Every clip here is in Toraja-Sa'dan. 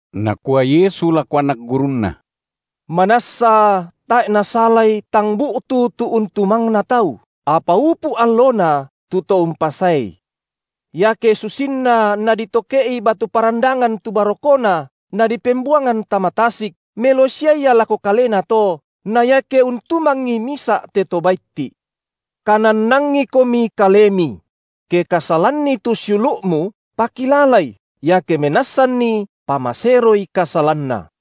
Nakua Yesu lako anak gurunNa: Manassa tae’ nasalai tang bu’tu tu untumangna tau, apa upu’ allona tu to umpasaei. Iake susinna naditoke’i batu parandangan tu barokona, nadipembuangan tama tasik, melo sia ia lako kalena to na iake untumangi misa’ te to baitti’! Kanannangikomi kalemi! Ke kasalanni tu siulu’mu, pakilalai, iake menassanni pamaseroi kasalanna.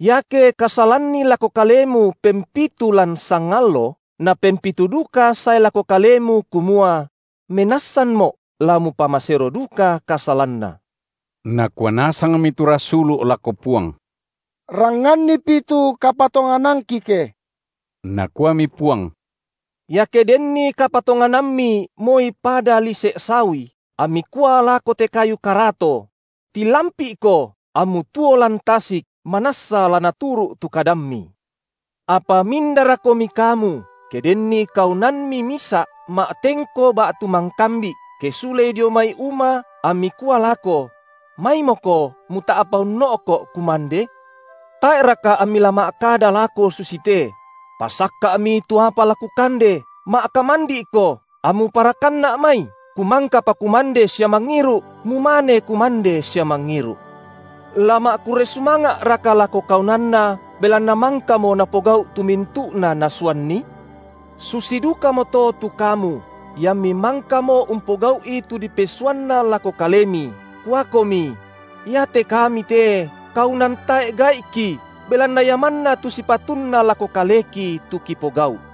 Iake kasalanni lako kalemu pempitu lan sangallo, napempitu duka sae lako kalemu kumua: menassanmo’, la mupamasero duka kasalanna. Nakua nasangmi tu rasulu’ lako Puang: Rangngannipi tu kapatonganangki ke! Nakuami Puang: Iake denni kapatonganammi moi pada lise’ sawi, ammi kua lako te kayu karato: Tilampi’ko, ammu tuo lan tasik, manassa la naturu’ tu kadammi. Apa mindarakomi kamu, ke denni kaunanmi misa’ ma’tengko ba’tu mangkambi’, ke sulei dio mai uma ammi kua lako: Maimoko muta’pa unno’ko’ kumande? Tae’raka ammi la ma’kada lako susite: Pasakka’mi tu apa la kukande, ma’kamandi’ko, ammu parakanna’ mai, kumangkapa kumande sia mangiru’, mumane kumande sia mangiru’. La ma’kurre sumanga’raka lako kaunanna, belanna mangkamo napogau’ tu mintu’na nasuanni? Susi dukamoto tu kamu, iammi mangkamo umpogau’i tu dipesuanna lako kalemi, kuakomi: Iate kami te kaunan tae’ gai’ki, belanna ia manna tu sipatunna lako kaleki tu kipogau’.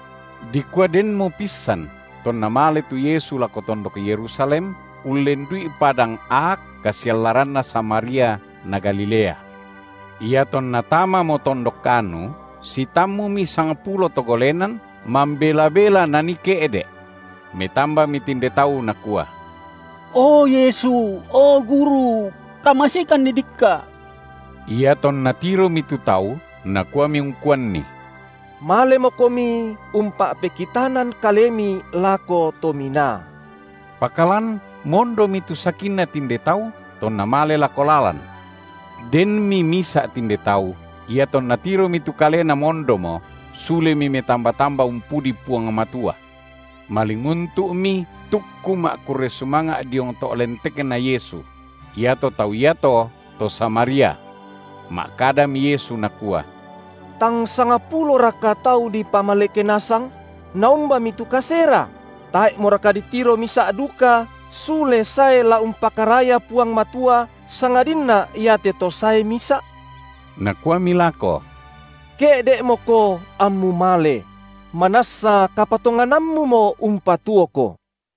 Dikua denmo pissan tonna male tu Yesu lako tondok Yerusalem, ullendu’i padang aak kasiallaranna Samaria na Galilea. Iatonna tamamo tondok anu, sitammumi sangpulo to golenan, mambela-bela nanii ke’de’. Metambami tinde tau, nakua: O Yesu, o Guru! kamaseikanni dikka’. Iatonna tiromi tu tau, Nakuami ungkuanni: Malemokomi umpa’pekitanan kalemi lako to minaa. Pakalan mondomi tu sakinna tinde tau tonna male lako lalan. Denmi misa’ tinde tau, iatonna tiromi tu kalena mondomo, sulemi metamba-tamba umpudi Puang Matua. Malinguntu’mi tukku ma’kurre sumanga’ diong to’ lentekNa Yesu; iato tau iato, to Samaria. Ma’kadami Yesu Nakua: Tang sangpuloraka tau dipamaleke nasang? Naumbami tu kasera? Tae’moraka ditiro misa’ duka sule sae la umpakaraya Puang Matua, sangadinna iate to sae misa’? Nakuami lako: Ke’de’moko ammu male: manassa kapatonganammumo umpatuoko.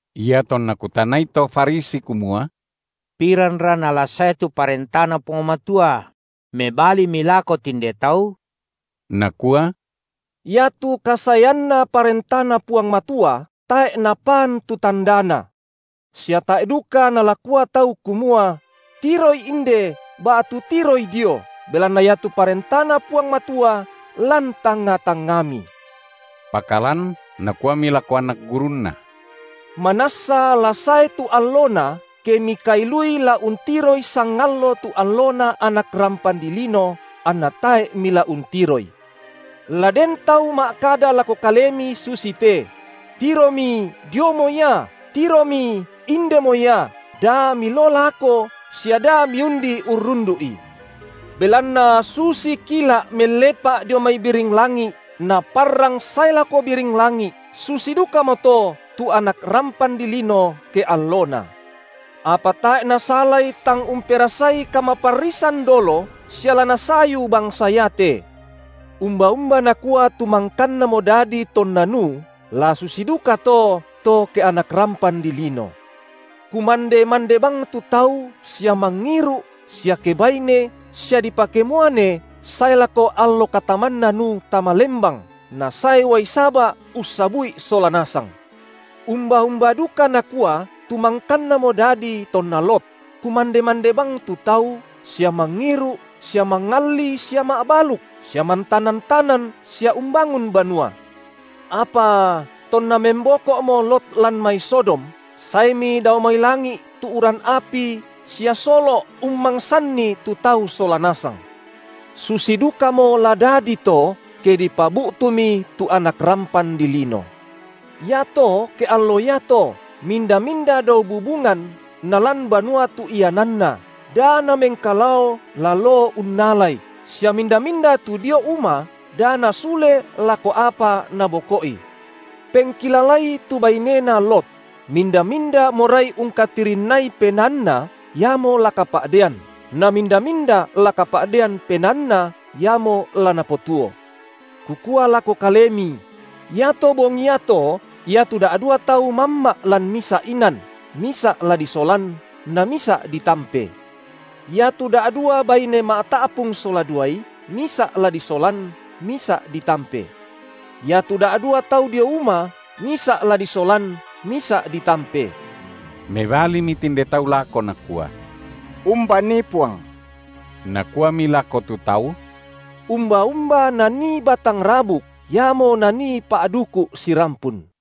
Iatonna kutanai to Farisi kumua: piranra nala sae tu ParentaNa Puang Matua? mebalimi lako tinde tau, Nakua: Iatu kasaeanna ParentaNa Puang Matua tae’ napaan tu tandana. Sia tae’ duka nala kua tau kumua: Tiroi inde, ba’tu tiroi dio, belanna iatu ParentaNa Puang Matua lan tangnga-tangngami. Pakalan Nakuami lako anak gurunNa: Manassa la sae tu allona, ke mikailui la untiroi sangallo tu alloNa Anak rampan dilino, anna tae’ mila untiroi. La den tau ma’kada lako kalemi susite: Tiromi diomo ia, tiromi indemo ia, da miloo lako sia da miundi urrundu’i. Belanna susi kila’ mellepa’ dio mai biring langi’ naparrang sae lako biring langi’, susi dukamoto tu Anak rampan dilino, ke alloNa. Apa tae’ nasalai tang umperasai kamaparrisan dolo sia la nasayu bangsa iate. Umba-umba nakua tu mangkannamo dadi tonna Nuh, la susi dukato, to ke Anak rampan dilino: Kumande-mande bang tu tau sia mangiru’ sia kebaine sia dipakemuane sae lako allo katamanna Nuh tama lembang nasae uai saba’ ussabu’i sola nasang. Umba-umba duka nakua tu mangkannamo dadi tonna Lot: kumande-mande bang tu tau sia mangiru’ sia mangalli sia ma’baluk, sia mantanan-tanan sia umbangun banua. Apa tonna memboko’mo Lot lan mai Sodom, saemi dao mai langi’ tu uran api sia solo’ ummangsanni tu tau sola nasang. Susi dukamo la dadi to, ke dipabu’tumi tu Anak rampan dilino. Iato ke allo iato, minda-minda dao bubungan nalan banua tu iananna, da namengkalao la loo unnalai, sia minda-minda tu dio uma, da nasule lako apa naboko’i. Pengkilalai tu bainena Lot! Minda-minda morai ungkatirinnai penaanna, iamo la kapa’dean, na minda-minda la kapa’dean penaanna, iamo la napotuo. Kukua lako kalemi: Iato bongi iato, iatu da’dua tau mamma’ lan misa’ inan, misa’ la disolan, namisa’ ditampe. Iatu da’dua baine ma’ta’pung sola duai, misa’ la disolan, misa’ ditampe. Iatu da’dua tau dio uma, misa’ la disolan, misa’ ditampe. Mebalimi tinde tau lako nakua: Umbanii, Puang? Nakuami lako tu tau: Umba-umba nanii batang rabuk, iamo nanii pa’duku’ sirampun.